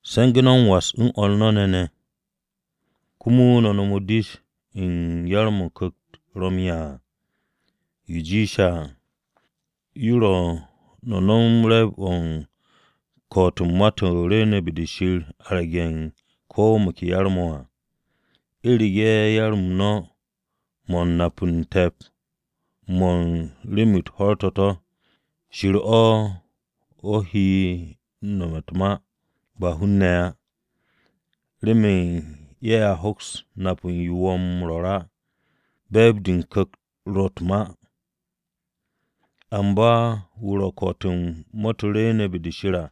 Se̱ngu̱ no̱ m-was u̱n o̱r no̱ ne̱, komo no̱ nom dish-o̱ u̱n yar-mo̱ Ku̱kt-o ro̱ m-'ya à. Yo jiishe̱ à, yo ro̱ no̱ nom re̱e̱b-o̱ u̱n ko̱'o̱t-o̱ u̱n ma-to̱ rwu̱u̱ne̱ be-de Shir à arge̱ ko̱ mo̱ ke yar-mo̱ à. U̱rege̱ yar-m no̱ mo̱ u̱n nap u̱n te̱p mo̱ u̱n rem-u̱t ho̱r-to̱, Shir-o̱ o he nome̱ u̱t-ma, ba hun-ne̱ á, remen ye̱a hoks m-nap u̱n yo wo̱ m-rwo̱r á. U̱n be̱e̱b-de o-Ku̱kt o ro̱ u̱t-ma. Amba wu̱ ro̱ u̱n ko̱'o̱t-o̱ u̱n ma-to̱ rwu̱u̱ne̱ be-de Shir à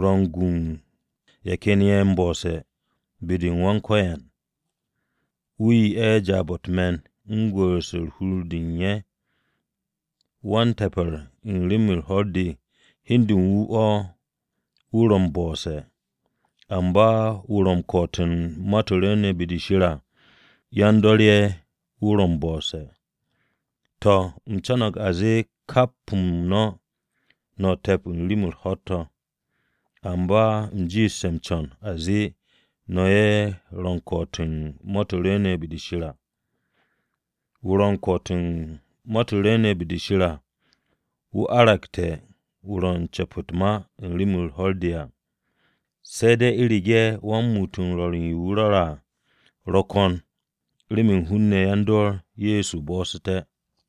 ro̱ m-gu u̱n ye̱ ken ye̱ m-bo̱'o̱se̱ be-u̱r Wan-Ko̱yan. Wu̱ 'ye ye̱ jaab-o̱ u̱t-me̱n wu̱ gwu̱'u̱rse̱ hur-de u̱n ye̱. Wa-m-te̱pe̱r u̱n rem-u̱r ho̱r-de hi u̱n de u̱n wu̱ o̱ wu̱ ro̱ m-bo̱'o̱se̱. Amba wu̱ ro̱ u̱n ko̱'o̱t-o̱ u̱n ma-to̱ rwu̱u̱ne̱ be-de Shir à yan-dor ye̱ wu̱ ro̱ m-bo̱'o̱se̱. To̱, u̱m co̱no̱g a zee kap-m no̱, no̱ te̱p u̱n rem-u̱t ho̱r-to̱. Amba u̱m jiishte̱ m-co̱n a zee no̱ ye̱ ro̱ u̱n ko̱'o̱t-o̱ u̱n ma-to̱ rwu̱u̱ne̱ be-de Shir à. Wu̱ ro̱ u̱n ko̱'o̱t-o̱ u̱n ma-to̱ rwu̱u̱ne̱ be-de Shir à, wu̱ aragte̱ wu̱ ro̱ u̱n ce̱p u̱t-ma u̱n rem-u̱r ho̱r-de à, se̱ de̱ u̱rege̱ wa-m-muut m-rwo̱r u̱n yo wu̱ rwo̱re̱ à ro̱ ko̱n remen hun-ne̱ yan-dor Ye̱so bo̱'o̱su̱té̱.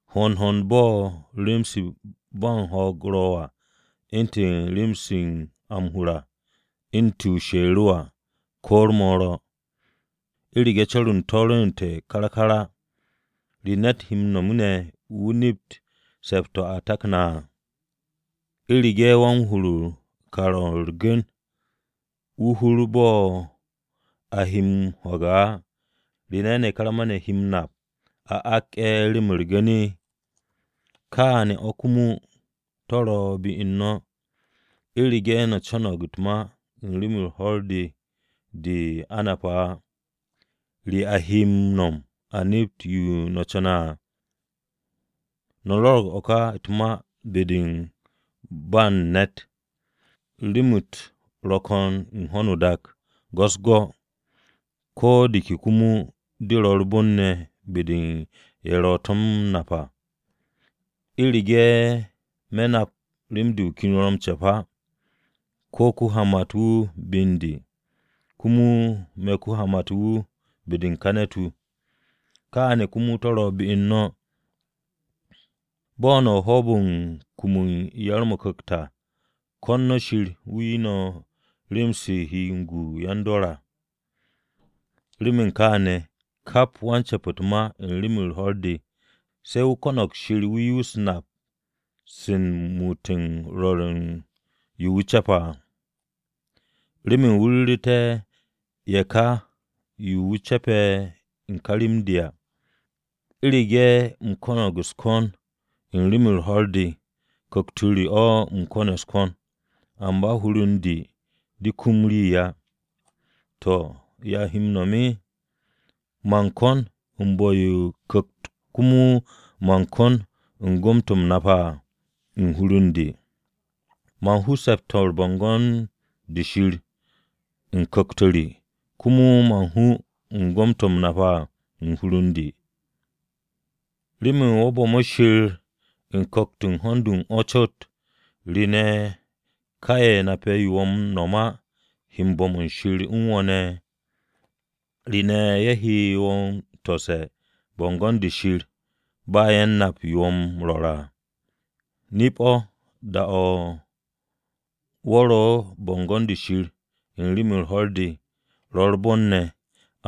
Hond hond-o̱ bo̱ rem-se ba u̱n ho̱o̱g ro̱ à, u̱ntu̱n rem-se a m-hur à, u̱ntu̱ o-sherewa ko̱ u̱r-moro. U̱rege̱ co̱r-o̱ u̱n to̱ rwu̱u̱n kár kár á, ¿re ne̱t he m-no̱m ne̱ wu̱ nept se̱p-o̱ a takne̱ à? U̱rege̱ wa-m-hur o-kar o̱ u̱r-gu̱n wu̱ hur o̱ bo̱ a he o̱ m-ho̱ge̱ á, ¿re ne̱ karma-ne̱ he m-nap a ak ye̱ remen u̱r-gu̱n ne̱? Kaane̱ o̱ komo to̱ ro̱ be u̱n no̱. U̱rege̱ no̱ ce̱k u̱t-ma u̱n rem-u̱r ho̱r-de de a nape̱ á, ¿re a he m-no̱m a nept yo o co̱ne̱ à? No̱ rwo̱ro̱g o̱ ka u̱t-ma be-de u̱n ba u̱n ne̱t. Rem-u̱t ro̱ ko̱n u̱n ho̱no o-dak go̱-u̱s-go̱, ko̱ de ke komo de ro̱ u̱r-bon ne̱ be-de u̱n ye̱ ro̱ to̱ m-nap à. U̱rege̱ me̱ nap rem-de wu̱ ken wu̱ ro̱ m-ce̱p á, wu̱ ko-hamat-wu̱ be u̱n de, komo me̱ ko-hamat-wu̱ be-de u̱n ká ne̱t-wu̱. Kaane̱ komo to̱ ro̱ be u̱n no̱. Bo̱ no̱ u̱n hoob-o̱ u̱n kum u̱n yar-mo̱ o-Ku̱kt à, ko̱n no̱ Shir o̱ 'ye no̱ rem-se he m-gu u̱n yan-dor à. Remen kaane̱, kap wan-ce̱p u̱t-ma u̱n rem-u̱r ho̱r-de, se̱ wu̱ ko̱no̱g Shir 'ye wu̱ nap-se u̱n muut m-rwo̱r u̱n yo wu̱ ce̱pe̱ à, remen wu̱ ru̱ru̱té̱ ye̱ ka yo wu̱ ce̱pe̱ u̱n de ka rem-de à. U̱rege̱ u̱m ko̱no̱g u̱s-ko̱n u̱n rem-u̱r ho̱r-de, ku̱kt-o re o̱ ko̱ne̱ u̱s-ko̱n, amba hur u̱n de de kum rii á. To̱, ¿ya u̱m he m-no̱m? Man kon u̱n bu̱-yo o-ku̱kt komo man kon u̱n gom-to̱ nape̱ à u̱n hur u̱n de. Man hu se̱p-to̱ u̱n bo̱ngo̱n-de Shir u̱n ku̱kt-o re, komo man hu u̱n gom-to̱ u̱m nape̱ à u̱n hur u̱n de. Remen wo̱ bu̱me̱ Shir o-ku̱kt u̱n hond u̱n o̱ cot, ¿re ne̱ ka ye̱ nape̱ yo wo̱ m-no̱m á he bo̱m u̱n Shir u̱n wo̱ ne̱? ¿Re ne̱ ye̱ he wo̱ m-tose̱ bo̱ngo̱n-de Shir ba ye̱ u̱n nap yo wo̱ m-rwo̱r á? Nip-o̱, da-o̱ wo̱ ro u̱n bo̱ngo̱n-de Shir u̱n u̱n rem-u̱r ho̱r-de, ro̱ u̱r-bon ne̱.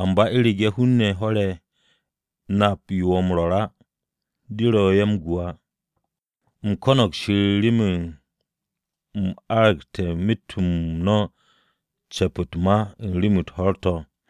Amba u̱rege̱ hun-ne̱ ho̱r-ye̱ nap yo wo̱ m-rwo̱r á, de ro̱ ye̱ u̱n gu á. U̱m bo̱mo̱g Shir remen u̱m aragte̱ myet-m no̱ ce̱p u̱t-ma u̱n rem-u̱t ho̱r-to̱.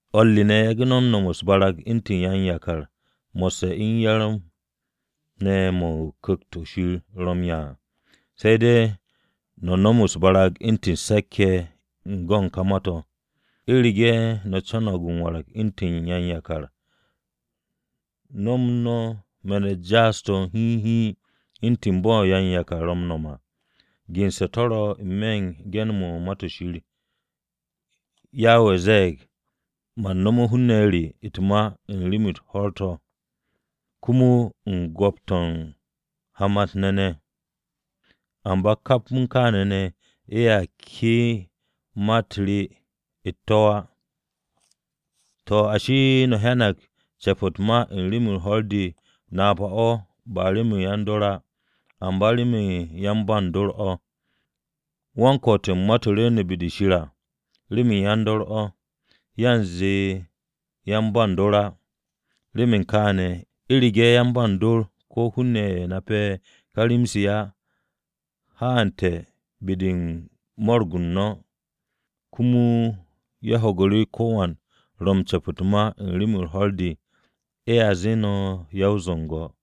O̱r re ne̱, yage̱ no̱ nomot u̱s-barag u̱ntu̱n yan-yakar mo̱sse̱ m-yar ne̱ mo̱ Ku̱kt-o̱ Shir ro̱ m-'ya à. Se̱ de̱, no̱m no̱ u̱s-barag u̱ntu̱n se̱k-ye̱ u̱n go̱n ka ma-to̱. U̱rege̱ no̱ co̱no̱g m-warag u̱ntu̱n yan-yakar, nom no̱ me̱n-u̱t jaas-to̱ hiin hiin u̱ntu̱n bo̱ yan-yakar ro̱ m-nom à. Gense̱ to̱ ro̱ n-me̱ u̱n ge̱n-mo̱ u̱n Ma-to̱ Shir: Yawe zee, “Man nome̱ hun-ne̱ re u̱t-ma u̱n rem-u̱t ho̱r-to̱, komo u̱n go̱p-to̱ u̱n hamat-ne̱ ne̱, Amba kap u̱n kaane̱ ne̱, ye̱a ke'e̱ ma-u̱t re u̱t-to̱ á.” To̱ ashi, no̱ hyanag ce̱p u̱t-ma u̱n rem-u̱r ho̱r-de napa-o̱ ba remen yan-dor á, amba remen yan-ba u̱n dor o̱. Wa u̱n ko̱'o̱t u̱n ma-to̱ rwu̱u̱ne̱ be-de Shir à remen yan-dor o̱, yanze yan-ba u̱n dor á. Remen kaane̱, u̱rege̱ yan-ba u̱n dor ko̱ hun-ne̱ ye̱ nape̱ ka rem-se á haante̱ be-de u̱n mo̱ro̱g-u̱r no̱, komo ye̱ ho̱gu̱ru̱ ko̱wan ro̱ m-ce̱p u̱t-ma u̱n rem-u̱r ho̱r-de, ye̱a zee no̱ ya-o-zu̱ngo̱ ye̱.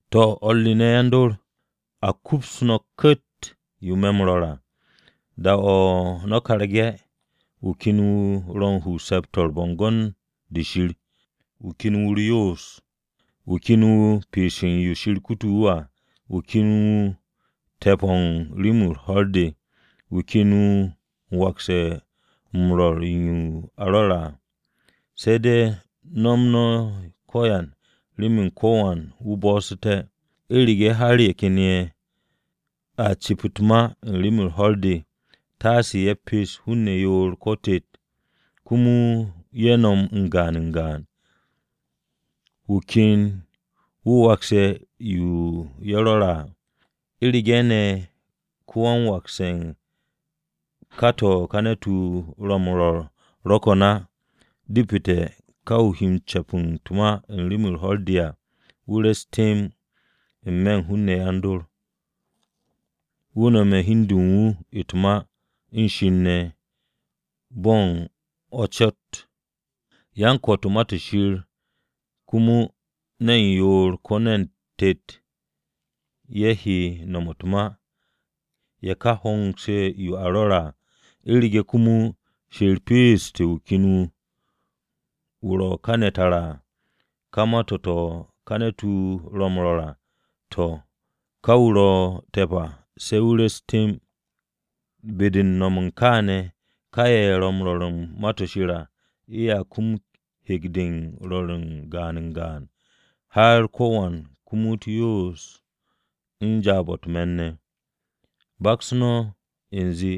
To̱, o̱r re ne̱ yan-dor, a kups no̱ ku̱tt yo me̱ m-rwo̱r à: Da-o̱ no̱ karge̱, wu̱ ken wu̱ ro̱ u̱n hu u̱n se̱p-to̱ u̱n bo̱ngo̱n-de Shir, wu̱ ken wu̱ u̱r-yoos, wu̱ ken wu̱ u̱r-pees u̱n yo Shir kute̱ wu̱ à, wu̱ ken wu̱ te̱p-o̱ u̱n rem-u̱r ho̱r-de, wu̱ ken wu̱ wakse̱ m-rwo̱r u̱n yo a rwo̱re̱ à, se̱ de̱ nom no̱ ko̱yan remen ko̱wan wu̱ bo̱'o̱su̱té̱. U̱rege̱ har ye̱ ken ye̱ a cep u̱t-ma u̱n rem-u̱r ho̱r-de, taase ye̱ pes hun-ne̱ yoor ko̱ tet, komo ye̱ nom n-gaan n-gaan, wu̱ ken wu̱ wakse̱ yo ye̱ rwo̱re̱ à. U̱rege̱ ne̱ ko-wan-wakse̱ u̱n ka to̱ ka ne̱t-wu̱ ro̱ m-rwo̱r ro̱ ko̱n á, depete̱ ka wu̱ ro̱ u̱n ce̱p u̱t-ma u̱n rem-u̱r ho̱r-de à wu̱ re̱s temb n-me̱ u̱n hun-ne̱ yan-dor. Wu̱ nome̱ hi u̱n de u̱n wu̱ u̱t-ma u̱n Shir ne̱ bo̱ u̱n o̱ cot. Yan-ko̱'o̱t u̱n ma-to̱ Shir komo ne̱n yoor ko̱ ne̱n tet ye̱ he no̱m u̱t-ma, ye̱ ká hongse̱ yo a rwo̱re̱ à. U̱rege̱ komo Shir peesu̱te̱ wu̱ ken wu̱, wu̱ ro̱ kane̱ tara à, ka ma-to̱ to̱ ka ne̱t-wu̱ ro̱ m-rwo̱r à, to̱, ká wu̱ ro̱ te̱p à se̱ wu̱ re̱s temb. Be-de u̱n no̱m u̱n kaane̱ ka ye̱ ro̱ m-rwo̱r u̱n Ma-to̱ Shir à, ye̱a kum hek-de m-rwo̱r gaan n-gaan, har ko̱wan kumut u̱r-yoos u̱n jaab-o̱ u̱t-me̱n ne̱. Baks no̱ u̱nze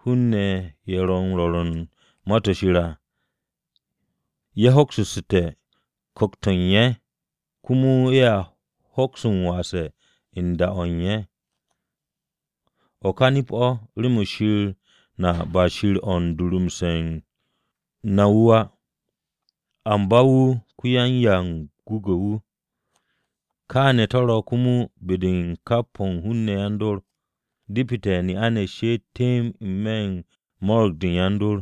hun-ne̱ ye̱ ro̱ m-rwo̱r u̱n Ma-to̱ Shir à, ye̱ hoksu̱ssu̱te̱ ku̱kt-o̱ u̱n ye̱ komo ye̱a hoks m-wase̱ u̱n da-o̱ u̱n ye̱. O̱ ka nip-o̱ remen Shir na ba Shir o̱ u̱n durumse̱ u̱n na wu̱ á, amba wu̱ ko-yan-m-gwu̱gwu̱-wu̱. Kaane̱ to̱ ro̱ komo be-de u̱n kap o̱ u̱n hun-ne̱ yan-dor. Depete̱ ne'a-ne̱ she'et temb n-me̱ u̱n mo̱ro̱g-de yan-dor.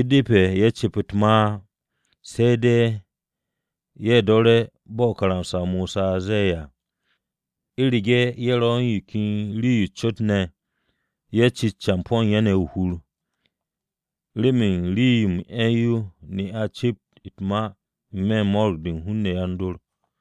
U̱depe̱ ye̱ cep u̱t-ma á. Se̱ de̱ ye̱ do̱re̱, bo̱ karamsa-o Mosa ze̱e̱ à. U̱rege̱ ye̱ ro̱ u̱n yo ken rii-yo o-cot yo ne̱, ye̱ cit campo̱ u̱n ye̱ ne̱ o-hur. Remen rii-yo m-'e̱ yo ne'a-ne̱ cep u̱t-ma n-me̱ u̱n mo̱ro̱g-de hun-ne̱ yan-dor.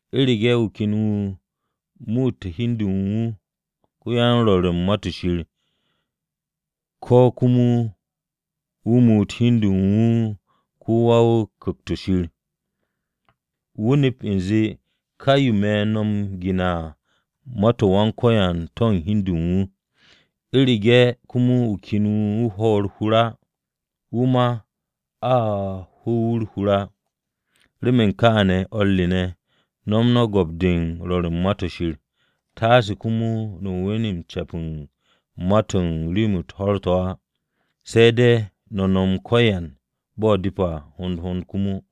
U̱rege̱ wu̱ ken wu̱ muute̱ hi u̱n de u̱n wu̱ ko-yan-rwo̱r u̱n Ma-to̱ Shir, ko̱ komo wu̱ muut hi u̱n de u̱n wu̱ ko̱wan Ku̱kt-o̱ Shir, wu̱ nep u̱nze, kà yo me̱ no̱ m-gene̱ à ma-u̱t Wan-Ko̱yan to̱ u̱n hi u̱n de u̱n wu̱. U̱rege̱ komo wu̱ ken wu̱ hwo̱ to̱ u̱r-hur á, wu̱ ma a hu̱u̱ wu̱ u̱r-hur á. Remen kaane̱, o̱r re ne̱, no̱m no̱ go̱p-de u̱n rwo̱r u̱n Ma-to̱ Shir. Taase komo no̱ we̱n ce̱p u̱n ma-to̱ u̱n rem-u̱t ho̱r-to̱ á. Se̱ de̱ no̱ nom ko̱yan bo̱ depe̱ à, hond hond komo.